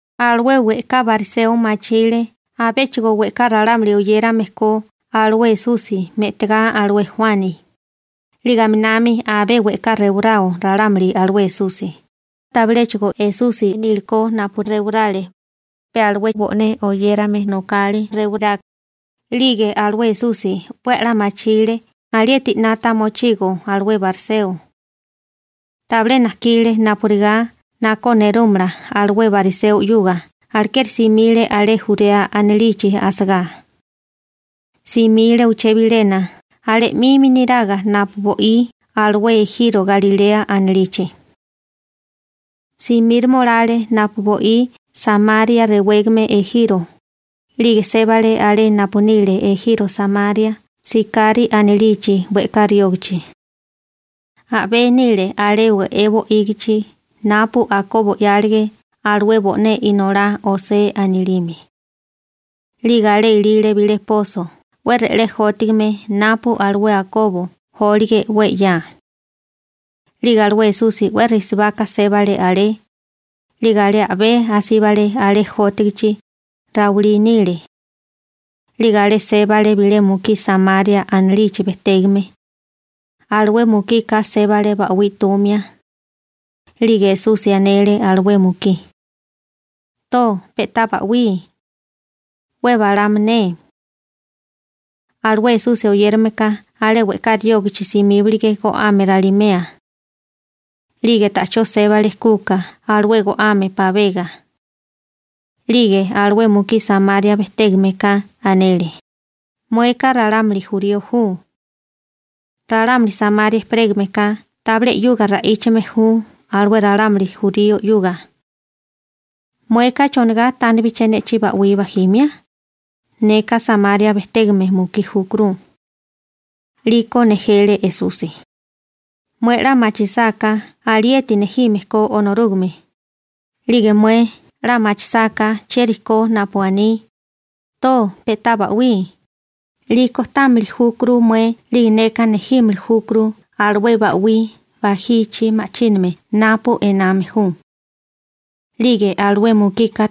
Alué we'ká bariseo machile abéchigo we'ká ralámuli oyérame ko alué Esusi me'tagá alué Juani, 'lige aminami abé we'ká rewarao ralámuli alué Esusi. (Tabiléchigo Esusi nílikó napu rewarale, pe alué bo'né oyérame nokale rewará.) 'Lige alué Esusi 'we a'lá machile alieti 'nata mochigo alué bariseo. Tabilé najkile napurigá nakó nerúmala alué bariseo 'yuga alekeri simile alé Jurea anilichi asagá. Simile uché bilena alé 'mimi niraga napu bo'í alué ejiro Galilea anilichi. Simíroma olale napu bo'í Samaria rewégame ejiro, 'lige sébale alé napu nile ejiro Samaria Sikari anilichi we'ká riógachi. A'bé nile alé we'é bo'ígichi napu Akobo 'yálige alué bo'né inolá José anilime. 'Lige alé ilile bilé poso 'we re'lé jótigime napu alué Akobo jólige 'we 'ya. 'Lige alué Esusi 'we risibaka sébale alé, 'lige alé a'bé asíbale alé jótigichi, rawilí nile. 'Lige alé sébale bilé mukí Samaria anilichi bejtégame, alué mukika sébale ba'wí 'tumia. 'Lige Esusi anele alué mukí: ―To pe'tá ba'wí, 'we balama ne. Alué Esusi oyérameka alé we'ká riógachi simíbalige go'ame ralimea, 'lige ta'chó sébale kuka alué go'ame pabega. 'Lige alué mukí Samaria bejtégame ka anele: ―Mueka ralámuli jurío ju. Ralámuli Samaria ejperégame ka tabilé 'yuga ra'íchame ju alué ralámuli jurío 'yuga. ¿Mueka chonigá tánibaché ne'chí ba'wí bajimia? Neka Samaria bejtégame mukí júkuru. 'Liko nejele Esusi: ―Mué 'la machisáká alieti nejime ko Onorúgame, 'lige mué 'la machisáká chieri ko napu aní: «To pe'tá ba'wí», 'liko támili júkuru mué 'lige neka nejímili júkuru alué ba'wí bajichi ma'chíname napu ename ju. (Alueka ruwime kéré Onorúgame a'walila ko.)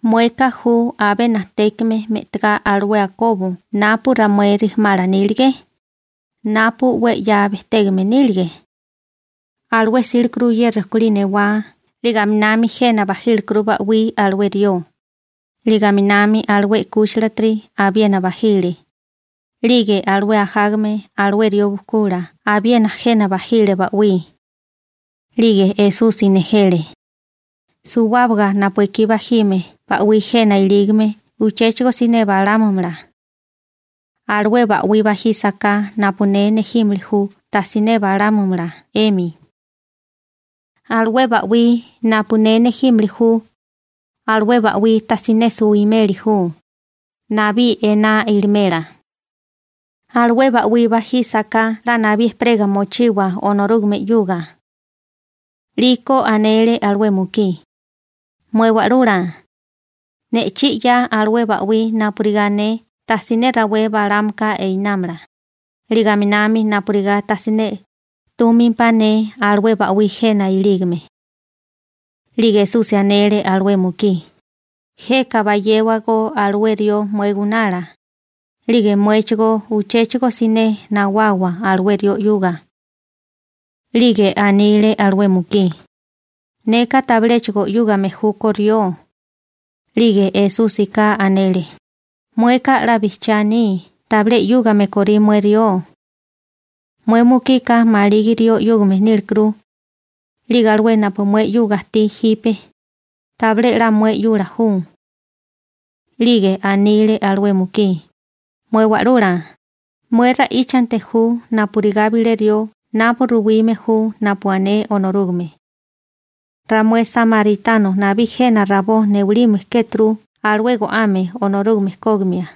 ¿Mueka ju abé najtékame me'tagá alué Akobo napu ramué rijimala nílige, napu 'we 'ya bejtégame nílige? Alué 'sílekuru ye rekolí newá 'lige aminami jena bajílekuru ba'wí alué rió, 'lige aminami alué 'kúchilatiri abiena bajile, 'lige alué ajágame alué rió bujkula abiena jena bajile ba'wí. 'Lige Esusi nejele: ―Suwábaga napu ekí bajime ba'wí jena ilígame uchéchigo siné balámumala. Alué ba'wí bajísaká napu ne nejímili ju tajsiné balámumala 'emi. Alué ba'wí napu ne nejímili ju, alué ba'wí tajsiné suwimeli ju, nabí ená ilimela. Alué ba'wí bajísaká 'la nabí ejperega mochiwa Onorúgame 'yuga. 'Liko anele alué mukí: ―Mué Wa'lula, ne'chí 'ya alué ba'wí napurigá ne tajsiné rawé balámaka einámala, 'lige aminami napurigá tajsiné 'túmimpá ne alué ba'wí jena ilígame. 'Lige Esusi anele alué mukí: ―Jeka bayéwagó alué rió mué gunala, 'lige muéchigó uchéchigo siné nawawa alué rió 'yuga. 'Lige anile alué mukí: ―Neka tabiléchigo 'yúgame júkó rió. 'Lige Esúsika anele: ―Mueka 'la bijchiá aní tabilé 'yúgame korí mué rió. Mué mukika maligi rió 'yúgame nílekuru, 'lige alué napu mué 'yuga ajtí jipe, tabilé 'la mué 'yula ju. 'Lige anile alué mukí: ―Mué Wa'lula, mué ra'íchanti ju napurigá bilé rió napu ruwime ju napu ané Onorúgame. Ramué samaritano nabí jena rabó newalime kéturu alué go'ame Onorúgame kógimia,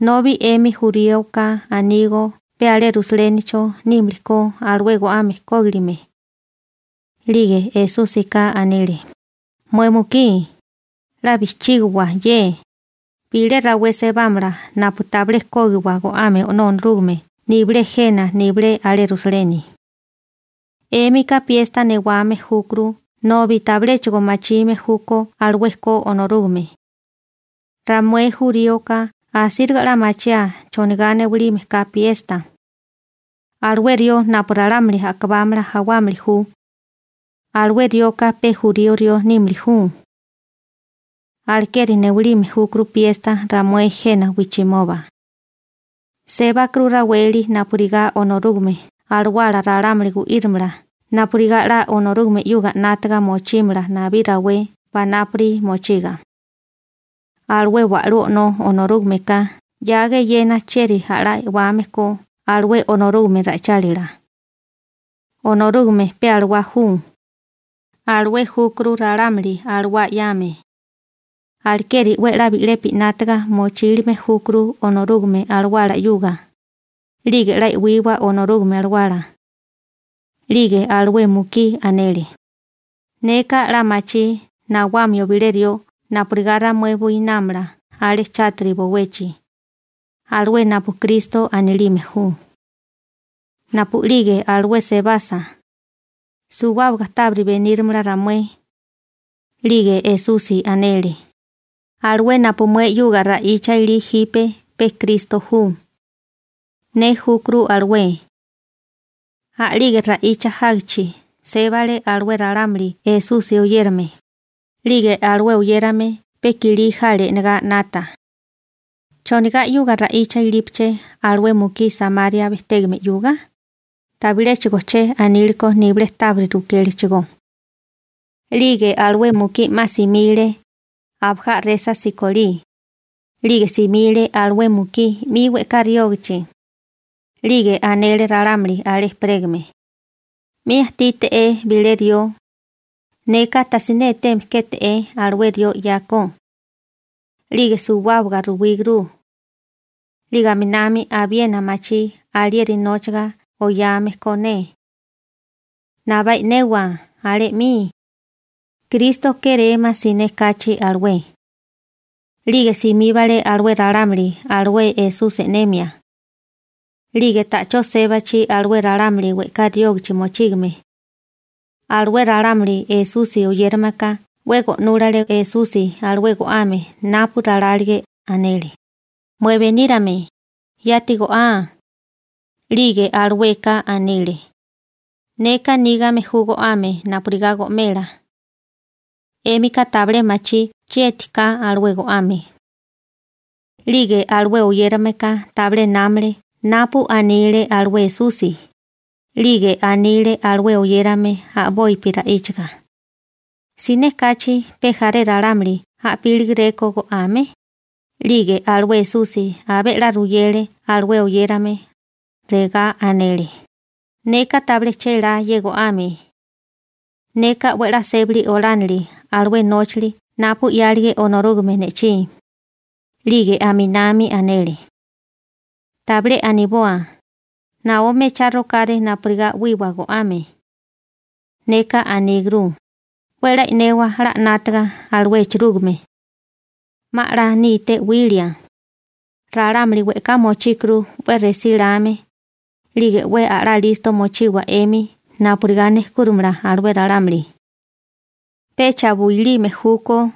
nobi 'emi juríoka anígó pe alé Rusalénicho nímili ko alué go'ame kógilime. 'Lige Esúsika anele: ―Mué mukí, 'la bijchígiwa ye: bilé rawé sebámala napu tabilé kógiwa go'ame O'nó Onorúgame nibilé jena nibilé alé Rusaleni. 'Émika piesta newame júkuru nobi tabiléchigo machime júkó alué ko Onorúgame. Ramué juríoka asíriga 'la machiaa chonigá newilime ka piesta. Alué rió napu ralámuli a'kabámana jawámili ju, alué rioka pe jurío rió nímili ju. Alekeri newalime júkuru piesta ramué jena wijchimoba. Sébakuru raweli napurigá Onorúgame Alawala ralámuli gu'írimala napurigá 'la Onorúgame 'yuga 'nátaga mochímala nabí rawé panápuri mochiga. Alué wa'lú O'nó Onorúgameka 'yaga eyena chieri a'lá e'wame ko alué Onorúgame ra'ichálila. Onorúgame pe alawá ju. Alué júkuru ralámuli alawá 'yame. Alekeri 'we a'lá bi'lepi 'nátaga mochílime júkuru Onorúgame Alawala 'yuga, 'lige 'la e'wiwa Onorúgame Alawala. 'Lige alué mukí anele: ―Neka 'la machí nawamio bilé rió napurigá ramué buinámala alé chátiri bowechi, alué napu Kristo (Mesíasi) anilime ju. Napu'lige alué sebasa, suwábaga tábiri beníramala ramué. 'Lige Esusi anele: ―Alué napu mué 'yuga ra'icha ilí jipe pe Kristo ju. Ne júkuru alué. A'lige ra'icha jágichi, sébale alué ralámuli Esusi oyérame, 'lige alué oyérame pe i'kilí jale e'negá 'nata: «¿Chonigá 'yuga ra'icha ilípaché alué mukí Samaria bejtégame 'yuga?» Tabiléchigo che aníleko nibilé tábiri rukélechigó. 'Lige alué mukí 'ma simile, abajá a'resa sikolí, 'lige simile alué mukí 'mi we'ká riógachi, 'lige anele ralámuli alé ejperégame: ―'Mi ajtíte'é bilé rió, neka tajsiné eteme kéte'é alué rió 'yako, 'lige suwábaga ruwíguru, 'lige aminami abiena machí alieri nóchaga oyame ko ne. Nabá e'newa alé 'mi. Kristo kérémá siné kachi alué. 'Lige simíbale alué ralámuli alué Esusi e'nemia. 'Lige ta'chó sébachi alué ralámuli we'ká riógichi mochígame, alué ralámuli Esusi oyérame ka 'we go'núlale Esusi alué go'ame napu ralálige, anele: ―Mué Benírame, yati go'á. 'Lige alueka anile: ―Neka nígame ju go'ame napurigá go'mela. 'Émika tabilé machí chieti ka alué go'ame. 'Lige alué oyérameka tabilé námale napu anile alué Esusi, 'lige anile alué oyérame a'bopi ra'íchaga: ―¿Siné kachi pe jaré ralámuli a'pílegeréko go'ame? 'Lige alué Esusi abé 'la ruyele alué oyérame, regá anele: ―Neka tabilé chélá ye go'ame. Neka 'we a'lá sébali olánili alué nóchali napu 'yálige Onorúgame ne'chí. 'Lige aminami anele: ―Tabilé aniboa: «Naó mechá rokáré napurigá 'wiwa go'ame.» Neka aníguru: «'We 'la e'newa 'la 'nátaga alué echerúgime. 'Ma 'la níté 'wilia.» Ralámuli we'ká mochíkuru 'we resíláme, 'lige 'we a'lá listo mochiwa 'emi napurigá nejkúrimala alué ralámuli. Pecha builime júkó.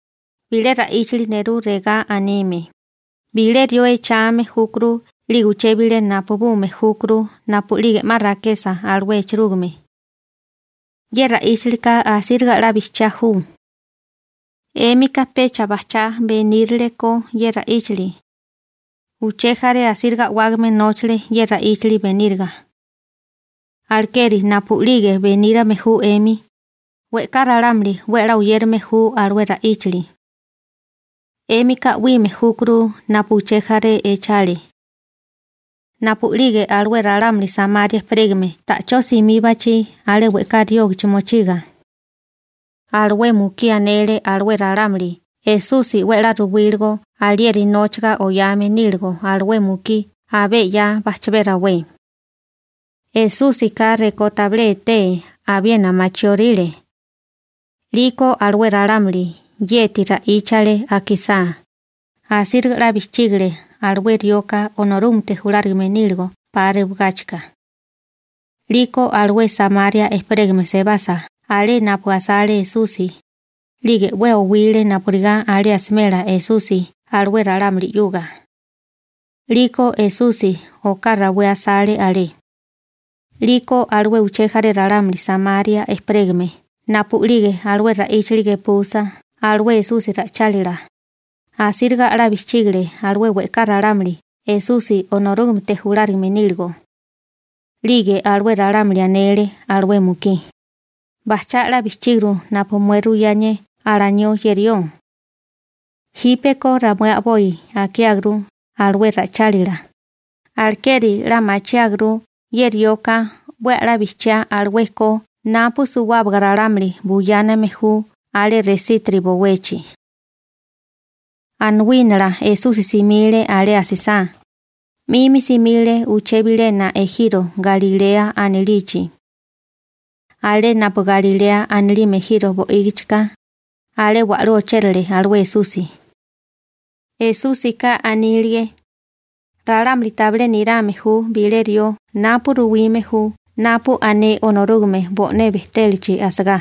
Bilé ra'íchali nerú regá anime: «Bilé rió echame júkuru 'lige uché bilé napabume júkuru napu'lige 'ma rakesa alué echerúgime.» Ye ra'íchalika asíriga 'la bijchiá ju. 'Émika pecha bajchá benírele ko ye ra'íchali, uché jaré asíriga a'wágame nóchale ye ra'íchali beníriga. Alekeri napu'lige benírame ju 'emi, we'ká ralámuli 'we a'lá oyérame ju alué ra'íchali. 'Émika 'wime júkuru napu uché jaré echale. Napu'lige alué ralámuli Samaria ejperégame ta'chó simíbachi alé we'ká riógichi mochiga, alué mukí anele alué ralámuli Esusi 'we a'lá ruwíligo alieri nóchaga oyame níligo alué mukí abé 'ya bajchabé rawé. Esúsika rekó tabilé etee abiena machióríle. 'Liko alué ralámuli yeti ra'íchale akisá, asíriga 'la bijchígale alué rioka Onorúgamete julárigame níligo 'pa rewigáchika. 'Liko alué Samaria ejperégame sebasa alé napu asale Esusi, 'lige 'we owile napurigá alé asimela Esusi alué ralámuli 'yuga. 'Liko Esusi oká rawé asale alé. 'Liko alué uché jaré ralámuli Samaria ejperégame napu'lige alué ra'íchili gepusa alué Esusi ra'ichálila, asíriga a'lá bijchígale alué we'ká ralámuli Esusi Onorúgamete julárigame níligo. 'Lige alué ralámuli anele alué mukí: ―Bajchá 'la bijchíguru napu mué ruyánié alanió ye rió. Jípeko ramué a'boi akiáguru alué ra'ichálila, alekeri 'la machiáguru ye rioka 'we a'lá bijchiá alué ko napu suwábaga ralámuli buyáname ju alé resítiri bowechi. Anawínala Esusi simile alé asisá, 'mimi simile uché bilena ejiro Galilea anilichi. Alé napu Galilea anilime ejiro bo'ígichika, alé wa'lú ochérale alué Esusi. (Esúsika anílige: «Ralámuli tabilé nirame ju bilé rió napu ruwime ju napu ané Onorúgame bo'né bejtélachi asagá.»)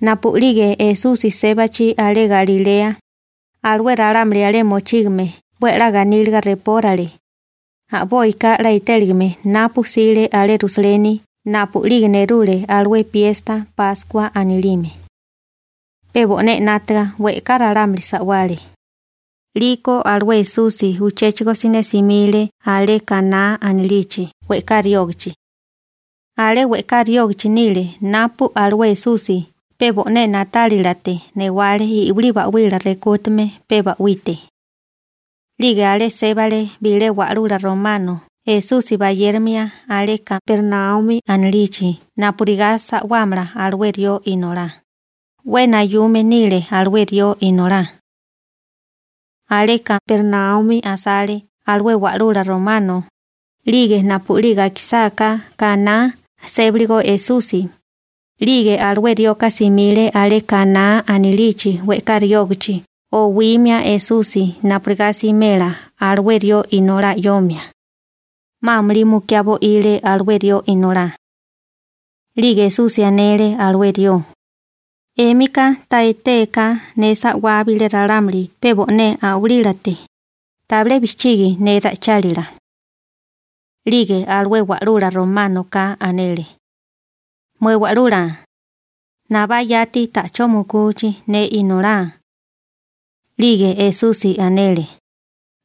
Napu'lige Esusi sébachi alé Galilea, alué ralámuli alé mochígame 'we a'lá ganíliga repórale, a'boika 'la etéligame napu 'sile alé Rusaleni napu'lige nerule alué piesta Páskua anilime. Pe bo'né 'nátaga we'ká ralámuli sa'wale. 'Liko alué Esusi uchéchigo siné simile alé Kaná anilichi we'ká riógichi. Alé we'ká riógichi nile napu alué Esusi pe bo'né na'tálilate newale i'wilí ba'wila rekútame pe ba'wite. 'Lige alé sébale bilé wa'lula romano Esusi bayérimia alé Kapernaumi anilichi napurigá sa'wámala alué rió inolá, 'we nayume nile alué rió inolá. Alé Kapernaumi asale alué wa'lula romano, 'lige napu'lige akisáká Kaná sébaligo Esusi, 'lige alué rioka simile alé Kaná anilichi we'ká riógachi owimia Esusi napurigá simela alué rió inolá 'yomia, 'ma amulí mukiá bo'ile alué rió inolá. 'Lige Esusi anele alué rió: ―'Émika ta etéaká ne sa'wá bilé ralámuli pe bo'né a'walílate, tabilé bijchigi ne ra'ichálila. 'Lige alué wa'lula románoka anele: ―Mué Wa'lula, nabá yati ta'chó mukuchi ne inolá. 'Lige Esusi anele: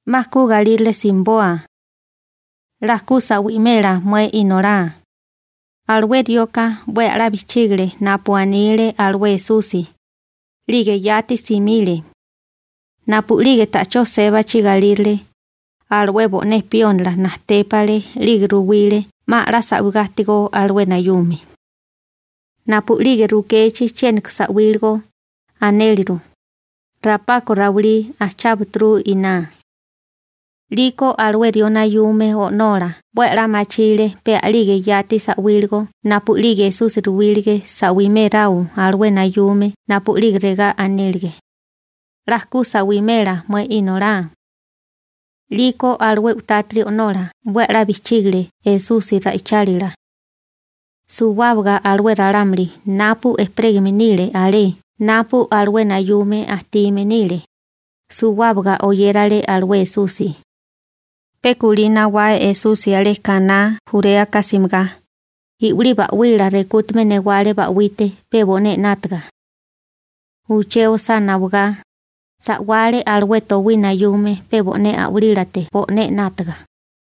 ―'Ma ku galírale simiboa. 'La ku sa'wimela mué inolá. Alué rioka 'we a'lá bijchígile napu anile alué Esusi, 'lige yati simile. Napu'lige ta'chó sébachi galírale, alué bo'né piónila najtépale 'lige ruwile 'ma a'lá sa'wigá ajtigó alué nayume. Napu'lige rukechi chiéniko sa'wíligo, anéleru: ―Rapako rawilí ajchábaturu iná. 'Liko alué rió nayume o'nola 'we a'lá machile pe a'lige yati sa'wíligo napu'lige Esusi ruwílige sa'wiméráo alué nayume napu'lige regá anélige: «'La ku sa'wimela mué inolá.» 'Liko alué u'tátiri o'nola 'we a'lá bijchígile Esusi ra'ichálila. Suwábaga alué ralámuli napu ejperégame nile alé napu alué nayume ajtime nile, suwábaga oyérale alué Esusi. Pe kulí nawá Esusi alé Kaná Juréaka simigá, i'wilí ba'wila rekútume newale ba'wite pe bo'né 'nátaga. Uché osá nawagá, sa'wale alué towí nayume pe bo'né a'walílate bo'né 'nátaga.